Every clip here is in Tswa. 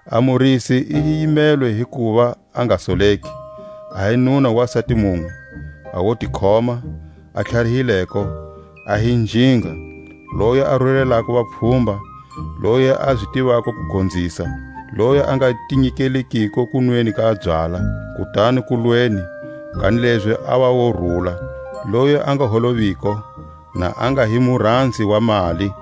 A murisi i yimelwe hi kuva a nga soleki, a hi nuna wa sati munwe, a wotikhoma, a tlharihileko, a hi njinga, loyi a rurelako vapfhumba, loyi a zi tivako ku gonzisa; loyi a nga ti nyikeliko kunweni ka byala, kutani kulweni; kanilezi a va wo rula, loyi a nga holoviko, na a nga hi muranzi wa mali;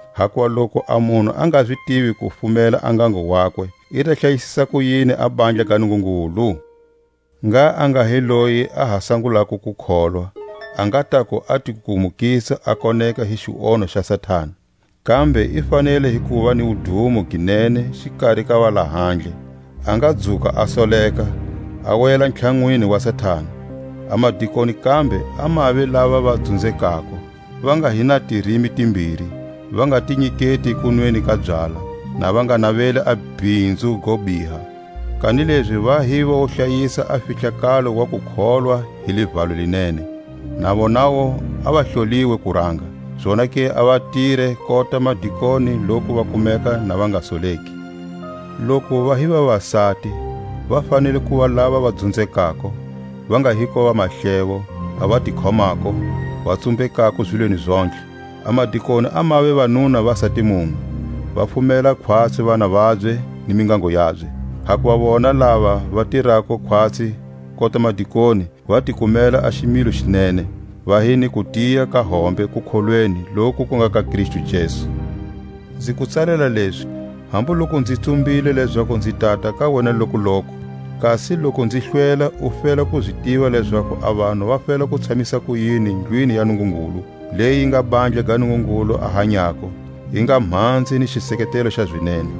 hakuva loku a munhu a nga zi tivi ku fumela a ngango wakwe, i ta hlayisisa kuyini a bandla ga Nungungulu? Ngha a nga hi loyi a ha sangulako ku kholwa, a nga taku a ti kukumukisa a koneka hi xionho xa Satani. Kambe i fanele hi kuva ni wudumo gi nene xikari ka valahandle; a nga dzuka a soleka, a wela ntlhanwini wa Satani. A madikoni kambe a mave lava va dzunzekako, va nga hi na tirimi timbiri, va nga ti nyiketi kunweni ka byala, na va nga naveli a bhinzu go biha; kanilezi va hi vo hlayisa a fihlakalo wa kukholwa hi livalo li nene. Na vonawu a va hloliwe kuranga; zonake a va tire kota madikoni loku va kumeka na va nga soleki. Loku va hi vavasati, va fanele kuva lava va dzunzekako, va nga hiko vamahlevo, a va ti khomako, va tsumbekako zilweni zontlhe. A madikoni a mave vanuna va sati munwe, va fumela khwatsi vana vabye ni mingango yabye. Hakuva vona lava va tirako khwatsi kota madikoni va ti kumela a ximilo xi nene, va hi ni kutiya ka hombe kukholweni loku ku nga ka Kristu Jesu. Nzi ku tsalela lezi, hambu loku nzi tsumbile lezaku nzi tata ka wena lokuloku; kasi loku nzi hlwela u fela ku zi tiva lezaku a vanhu va fela ku tshamisa kuyini ndlwini ya Nungungulu, leyi yi nga bandla ga Nungungulu a hanyako, yi nga mhanze ni xiseketelo xa zinene.